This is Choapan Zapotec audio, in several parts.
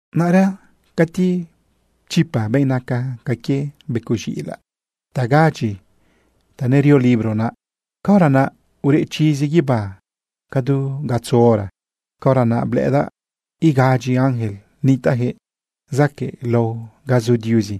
Naꞌra cati pchipa benꞌ naca ca quie becoꞌ z̃iꞌilaꞌ naꞌ tagadyi ta nerio libro naꞌ, caora naꞌ ureꞌ chizi guibá ca du gatzo hora. Caora naꞌ blëꞌëdaꞌ igadyi ángel nitaꞌjëꞌ zaquëꞌlao ga zu Diuzi.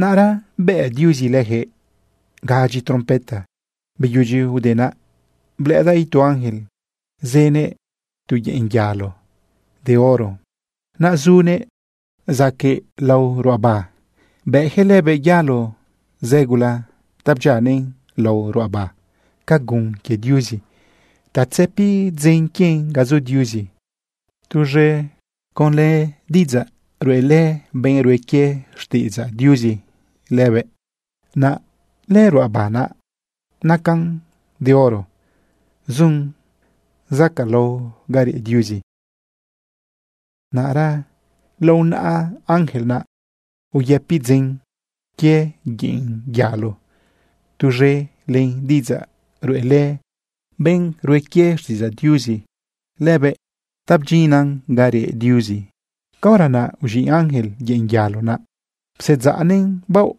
Naꞌra bëꞌ Diuzi lëjëꞌ gadyi trompeta. Beyudyi ude naꞌ, blëꞌëdaꞌ itu ángel zënëꞌ tu yeꞌn yalo de oro. Naꞌ zunëꞌ zaquëꞌlao lao ruꞌaba bëꞌjëꞌ lëbëꞌ yalo zë gula ta bdyianëꞌ lao ruꞌaba ca gun quie Diuzi ta tzëpi dzen quien ga zu Diuzi tuz̃e conlë diꞌidzaꞌ ruꞌelë benꞌ rue quie xtiꞌidzaꞌ Diuzi lëbëꞌ. Naꞌ lëruꞌaba naꞌ nacan de oro, zun zacaꞌlao ga reꞌ Diuzi. Naꞌra lao naꞌa ángel naꞌ uyëpi dzen quie yeꞌn yalo tuz̃e len diꞌidzaꞌ ruꞌelë benꞌ rue quie xtiꞌidzaꞌ Diuzi lëbëꞌ ta bdyinnan ga reꞌ Diuzi. Caora naꞌ uz̃iꞌ ángel yeꞌn yalo naꞌ psedzaꞌnëꞌn baoꞌ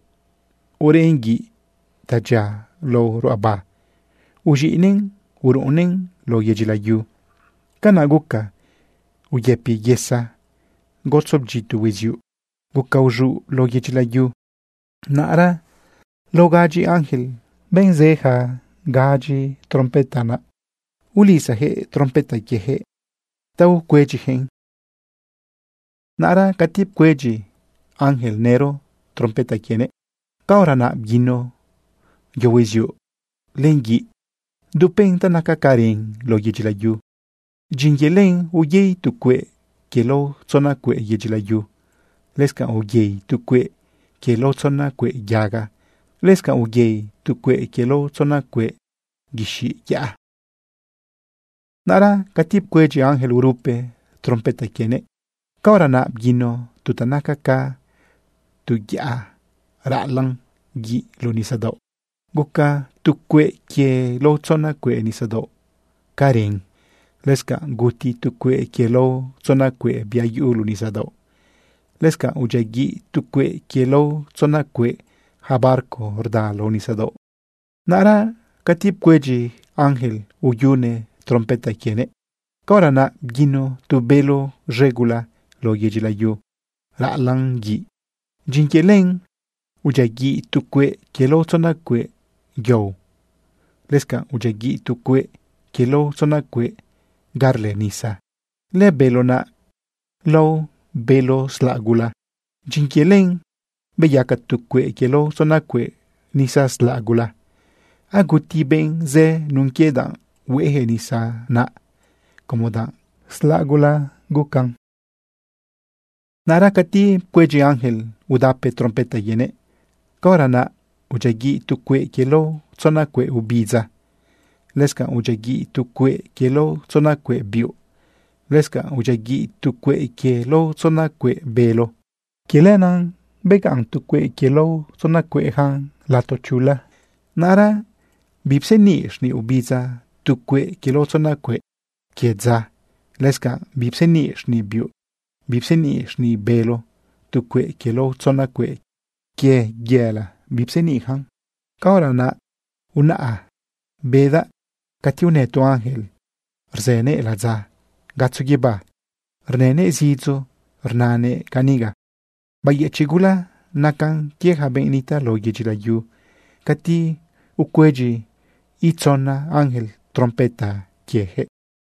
ureꞌn guiꞌ ta dyia lao ruꞌaba uz̃iꞌnëꞌn uruꞌunnëꞌn lao yedyi layu. Canaꞌ guca uyëpi yesa, gotzo bdyito hueziuꞌ, guca uz̃uꞌ lao yedyi layu. Naꞌra lao gadyi ja ángel, benꞌ zë ja gadyi trompeta naꞌ, ulisajëꞌ trompeta quiejëꞌ ta ucuedyijëꞌn. Naꞌra cati pcuedyi ángel nëro trompeta quienëꞌ, caora naꞌ bguino yo hueziuꞌ len guiꞌ dupen ta naca ca ren lao yedyi layu. Dyin quie len, uyei tu cueꞌ quie lao tzona cueꞌ yedyi layu, lëscanꞌ uyei tu cueꞌ quie lao tzona cueꞌ yaga, lëscanꞌ uyei tu cueꞌ quie lao tzona cueꞌ guixiꞌ yaꞌa. Naꞌra cati pcuedyi ángel urupe trompeta quienëꞌ, caora naꞌ bguino tu ta naca ca tu yaꞌa raꞌalaꞌn guiꞌ luꞌu nisadaoꞌ. Guca tu cueꞌ quie lao tzona cueꞌ nisadaoꞌ ca ren. Lëscanꞌ guti tu cueꞌ quie lao tzona cueꞌ bia yuꞌu luꞌu nisadaoꞌ, lëscanꞌ udyiaguiꞌ tu cueꞌ quie lao tzona cueꞌ ja barco rda lao nisadaoꞌ. Naꞌra cati pcuedyi ángel uyune trompeta quienëꞌ, caora naꞌ bguino tu bélo z̃e gula lao yedyi layu raꞌalaꞌn guiꞌ. Dyin quie len udyiaguiꞌ tu cueꞌ quie lao tzona cueꞌ yao, lëscanꞌ udyiaguiꞌ tu cueꞌ quie lao tzona cueꞌ ga rlë nisa. Lëbélo naꞌ lao bélo slaꞌ gula. Dyin quie len beyaca tu cueꞌ quie lao tzona cueꞌ nisa slaꞌ gula. Aguti benꞌ zë nun quie danꞌ hueꞌejëꞌ nisa naꞌ, como danꞌ slaꞌ gula beyacan. Naꞌra cati pcuedyi ángel udape trompeta quienëꞌ, caora naꞌ udyiaguiꞌ tu cueꞌ quie lao tzona cueꞌ ubidza, lëscanꞌ udyiaguiꞌ tu cueꞌ quie lao tzona cueꞌ biuꞌ, lëscanꞌ udyiaguiꞌ tu cueꞌ quie lao tzona cueꞌ bélo. Quie lenaꞌ begaꞌn tu cueꞌ quie lao tzona cueꞌjan lato chula. Naꞌra bipseniꞌ xniꞌ ubidza tu cueꞌ quie lao tzona cueꞌ quie dza. Lëscanꞌ bipseniꞌ xniꞌ biuꞌ, bipseniꞌ xniꞌ bélo. Tu cueꞌ quie lao tzona cueꞌ quie yela bipseniꞌyacan. Caora naꞌ unaꞌa bedaꞌ cati unë tu ángel rzënëꞌ ladza gatzo guibá. Rnënëꞌ zidzo rnanëꞌ caniga: ―¡Bayëchiꞌ gula nacan quie ja benꞌ nitaꞌ lao yedyi layu cati ucuedyi itzona ángel trompeta quiejëꞌ!